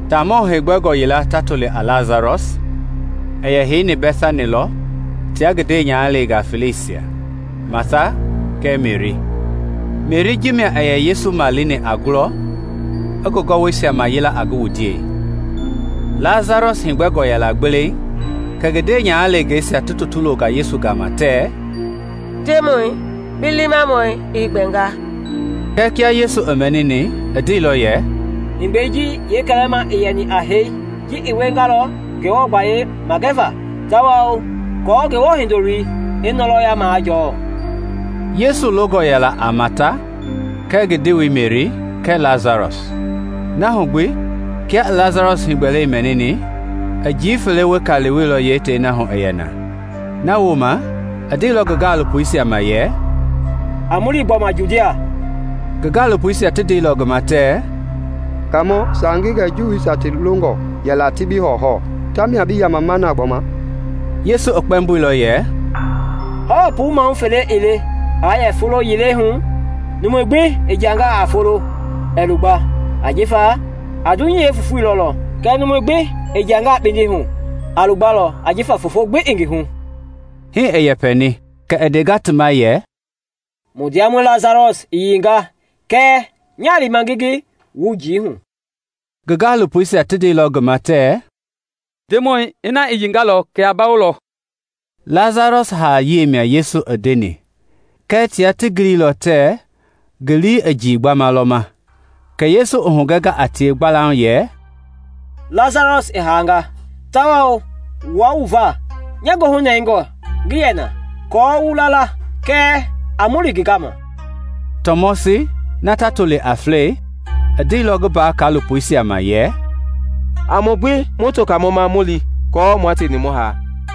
Taamɔ heegbɛngɔ yila ta toli a Lasarɔs, i yɛ heini Bɛtani lɔ tia ngi ndewenyahaleengaa feleisia, Mata kɛɛ Meri. (Meri ji mia i yɛ Yesu malini a ngulɔi, i ngi gɔwɔisia mayila a ngi wundiei.) Lasarɔs i heegbɛilɔ gbeleiŋ kɛ ngi ndewenyahaleengeisia ti tutu longa Yesu gama tɛɛ, “Ndemɔi, bi liimamɔi i heegbɛnga.” Kɛɛ kia Yesu i mɛnini, i ndeilɔ yɛ, “Heegbɛi ji yeekɛlɛma ii yɛni a hee. Ji i wiengalɔ Ngewɔ gbayei magɛva tawao aako Ngewɔ Hindoloi i ngɔlɔya majɔɔ.” Yesu longɔ yɛla a Mata kɛɛ ngi ndewei Meri kɛɛ Lasarɔs. Na hu gbi kia i Lasarɔs heegbɛlei mɛnini, i njii fele weka wieilɔ tei na hu i yɛ na. Na wooma i ndeilɔ ngi gaalopoisia ma yɛ, “A mu li gbɔma Judia.” Ngi gaalopoisia ti ndeilɔ ngi ma tɛɛ, “Kaamɔ, saange gɛ Juuisia ti longɔ yɛla ti bi hɔwɔhɔwɔ, tamia bi yamama na gbɔma?” Yesu i kpɛmboilɔ yɛ, “Hawa puu maahu fele ii le aa yɛ folo yilei hu? Numu gbi i jiangaa a foloi, ɛɛ lugba ajifa a dunyei ji yeefofoi lɔlɔ. Kɛɛ numu gbi i jiangaa kpindi hu, a lugbalɔ ajifa fofoi ii ngi hu.” Hii i yɛpɛni, kɛ i ndenga ti ma yɛ, “Mu ndiamɔi Lasarɔs i yiinga kɛɛ nyaa lima ngi ngi wu njii hu.” Ngi gaalopoisia ti ndeilɔ ngi ma tɛɛ, “Ndemɔi, ina i yiingalɔ, kɛ a bawolɔ.” Lasarɔs haa-yia mia Yesu i ndeni kɛɛ tia ti giliilɔ tɛɛ ngi lii i njii gbamɛi lɔ ma. Kɛ Yesu i hugɛnga a tie gbalauŋ yɛ, “Lasarɔs i haanga; tawao wua wu va nya goohu nɛngɔe ngii yɛ na, aako wu la la. Kɛɛ a mu li ngi gama.” Tɔmɔsi (na ti yɛ toli a Flɛi) i ndeilɔ ngi mbaa-kaalopoisia ma yɛ, “A mu gbi mu to Kaamɔ ma mu li aako mua tieni mu haa.”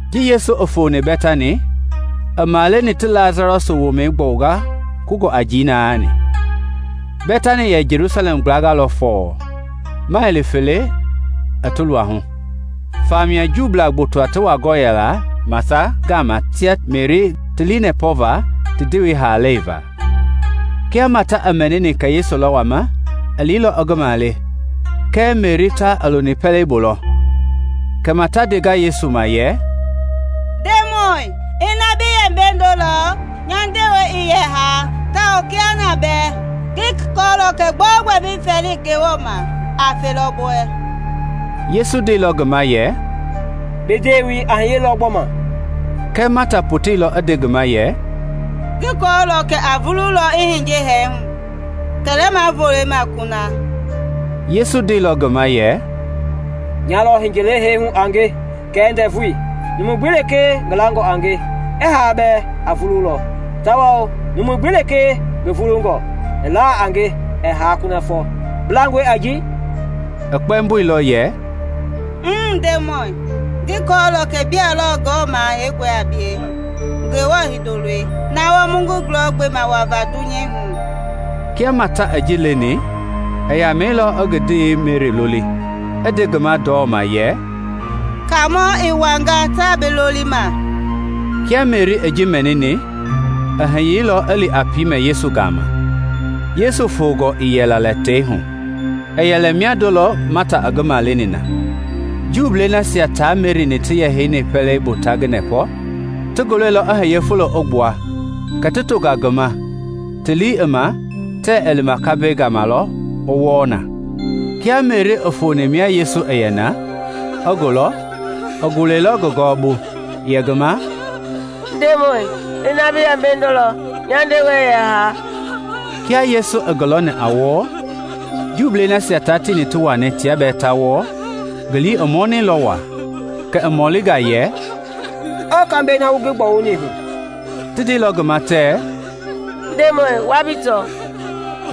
Ji Yesu i foni Bɛtani, i maleni ti Lasarɔs womɛi gbɔwunga kungɔ a njii naani. Bɛtani i yɛ Jelusalɛm gblanga lɔ fɔɔ, maili felekpe i ti luahu, famia Juu gboto ti wangɔ yɛla Mata gama tia Meri ti lii nɛpɔva ti ndewei haalei va. Kia Mata i mɛnini kɛ Yesu lɔ wama, i liilɔ i ngi male, kɛɛ Meri ta i loni pɛlei bu lɔ. Kɛ Mata i ndenga Yesu ma yɛ, “Ndemɔi, kiaa bi yɛ mbeindo lɔ nya ndewei ii yɛ haa. Tawao kiahuna bɛɛ ngi kɔɔlɔ kɛ gbɛogbɛ bi fɛɛlini Ngewɔ ma a felɔ bi wɛ.” Yesu ndeilɔ ngi ma yɛ, “Bi ndewei a hiyelɔ gbɔma.” Kɛɛ Mata poteilɔ i nde ngi ma yɛ, “Ngi kɔɔlɔ kɛ a vululɔ i hiye hee hu kɛlɛma volei ma kuna.” Yesu ndeilɔ ngi ma yɛ, “Nya lɔ hiye-haa-hui a nge kɛɛ ndɛvui; numu gbi lekee ngi langɔ a nge, i haa bɛɛ a vululɔ, Tawao numu gbi lekee ngi vulungɔ, i la a nge, ɛɛ haa kunafɔ. Bi langɔe a ji?” I kpɛmboilɔ yɛ, “Mmm, Ndemɔi, ngi kɔɔlɔ kɛ bia lɔ Ngewɔ Maha Heingɔi a bie, Ngewɔ Hindoloi, na wɔɔ mu ngi gulɔ gbema wava dunyei hu.” Kia Mata i ji leni, i yamɛilɔ i ngi ndewei Meri loli, i nde ngi ma ndɔma yɛ, “Kaamɔ i wanga, taa bi lolima.” Kia Meri i ji mɛnini, i hiyeilɔ i li a piimɛ Yesu gama. Yesu fongɔ ii yɛla tei hu, i yɛ lɛ miando lɔ Mata i ngi maleni na. Juu nasia tia Meri-ni ti yɛ pɛlei bu ta ngi nɛpɔ, ti ngi lɔilɔ i hiye fulo i gbua, kɛ ti tonga ngi ma, ti lii i ma tɛɛ i lima kambɛi gama lɔ i wɔɔ na. Kia Meri i foni mia Yesu i yɛ na, i ngi lɔ, i gulɛilɔ ngi gɔwɔbu yɛ ngi ma, “Ndemɔi, ina bi yɛ mbeindo lɔ, nya ndewei ii yɛ haa.” Kia Yesu i ngi lɔni a wɔɔ, Juui nasia tia tieni ti wani tia bɛɛ ta wɔɔ, ngi lii i minilɔ waa; Kɛ i mɔlinga yɛ, “Ɔɔ kambɛi na wu ngi gbɔwuni hu?” Ti ndeilɔ ngi ma tɛɛ, “Ndemɔi, wa bi tɔ.”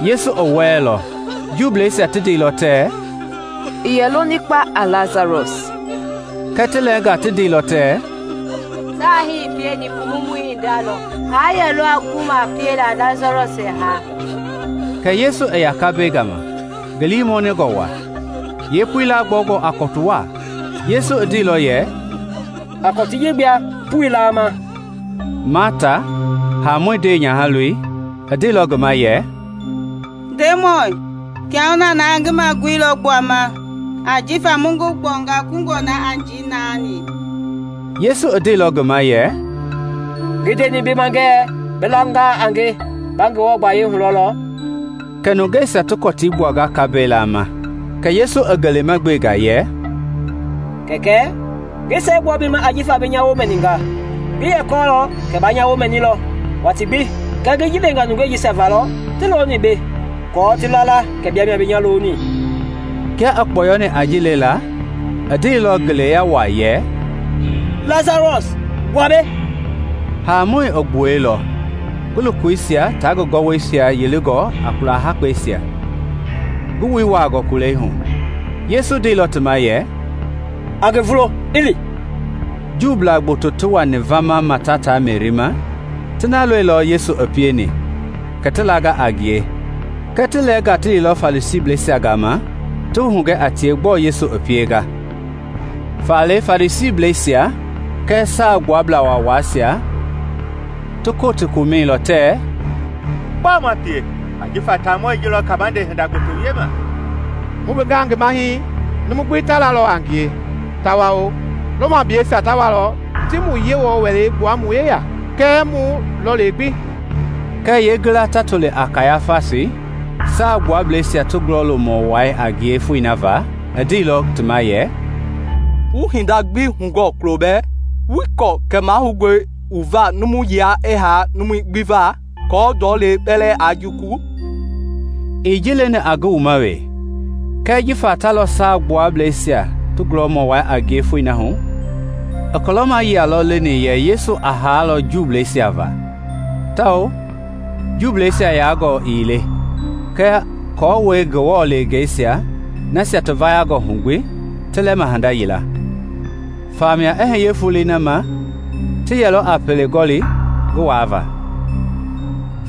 Yesu i wɔlɛilɔ. Juuisia ti ndeilɔ tɛɛ, “I yɛ loni kpa a Lasarɔs!” Kɛɛ ti lɛnga ti ndeilɔ tɛɛ, “Ta hii i pieni Pumumɔi i hinda lɔ, aa yɛlɔ gu a piela Lasarɔsi ɛɛ haa?” Kɛ Yesu i ya kambɛi gama, ngi lii mɔnɛngɔ waa; ye pui, laagbɔwungɔ a kɔtu waa. Yesu i ndeilɔ yɛ, “A kɔtii ji gbua pui laama.” Mata, haamɔi ndeenyahaloi, i ndeilɔ ngi ma yɛ, “Ndemɔi, kiahuna na ngi magui lɔ gbuama ajifa mu ngi gbɔwunga kungɔ na a njii naani.” Yesu i ndeilɔ ngi ma yɛ, “Ngii ndeni bi ma ngɛɛ bi langaa a nge ba Ngewɔ gbayayii hulɔlɔ?” Kɛ nungeisia ti kɔtii gbuanga kambɛi laama. Kɛ Yesu i ngelema gbenga yɛ, “Kɛkɛ, ngi siɛgbua bi ma ajifa bi nya woo mɛninga. Ngi yɛ kɔɔlɔ kɛ ba nya woo mɛnilɔ watii gbi, kɛɛ ngi ji lenga nungei jisia va lɔ ti looni mbei aako ti la la kɛ bia mia bi nya loni.” Kia i kpɔyɔni a ji lela, i ndeilɔ ngeleya waa yɛ, “Lasarɔsi, gbua mbei.” Haamɔi i gbuɛilɔ, ngi lokoisia tia ngi gɔwɔisia huyilingɔ a kula hakpɛisia, ngi wui wuaangɔ kulei hu. Yesu ndeilɔ ti ma yɛ, “A ngi vulo, i li.” Juu gboto ti wani vama Mata tia Meri ma, ti na lɔilɔ Yesu i pieni, kɛ ti langa a ngie; kɛɛ ti lɛɛnga ti liilɔ Farisiisia gama ti hugɛ a tie gbɔɔ Yesu i pienga. Faale Farisiisia tia Saagbuablaa Waawaisia ti Kotii gomɛilɔ tɛɛ, “Gbɔɔ ma pie? Ajifa taamɔi ji lɔ kabande hinda gboto wiema. Mu gbengaa ngi ma hii, numui gbi ta lalɔ a ngie, tawao Romableisia ta walɔ ti mu Yewɔ Wɛlei gbua mu yeya kɛɛ mu lɔlei gbi.” Kɛɛ yeengila ta toli a Kayafasi, Saagbuablɛisia ti gulɔmɔ wai a ngie foi na va, i ndeilɔ ti ma yɛ, “Wuii hinda gbi hugɔɔ kulo bɛɛ; wuii kɔɔ kɛ mahoungɔe wu va numu yila i haa numui gbi va, aako ndɔlei kpɛlɛɛ aa jukulu?” Ii ji leni a ngi wuma wee kɛɛ jifa ta lɔ Saagbuablɛisia ti gulɔmɔ wai a ngie foi na hu, i kulɔma yia lɔ leni yɛ Yesu a haalɔ Juuisia va, tawao Juuisia yaangɔ ii le, kɛɛ aako i Ngewɔ leengei nasia ti vayangɔ hu gbi ti lɛma hinda yila. Famia i hiye foloi na ma ti yɛlɔ a pele gɔli ngi waava.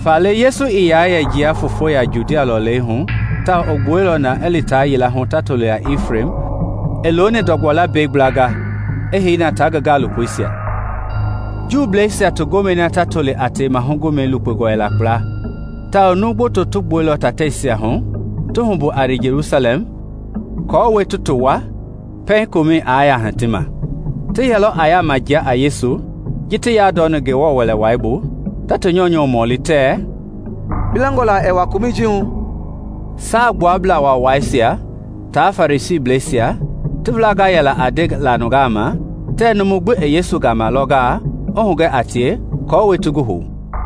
Faale Yesu ii yɛ yaa jia foofo hu Judia lɔlei hu tawao, i gbuɛilɔ na i li taa yila hu ta toli a Ifrem i looni ndɔgbɔ lambɛi gblanga, i hei na tia ngi gaalopoisia. Juuisia ti gomɛi yeewatii i lukpeilɔ kpla tawao numu gboto ti gbuɛilɔ tateisia hu ta li kulɔ Jelusalɛm aako ti ti wua pɛiŋ komɛi i yaa hiti ma. Ti yɛlɔ a yaama jia a Yesu ji ti yandɔni Ngewɔ Wɛlei bu, ta ti nyɔunyɔ mɔli tɛɛ, “Bi langɔ la ɛɛ wa komɛi ji hu?” Saagbuablaa Waawaisia tia Farisiisia ti wilangɔ yɛla a ndela nungaa ma tɛɛ numu gbi i Yesu yɛma gɔngalɔ, i hugɛ a tie aako ti ngi hou.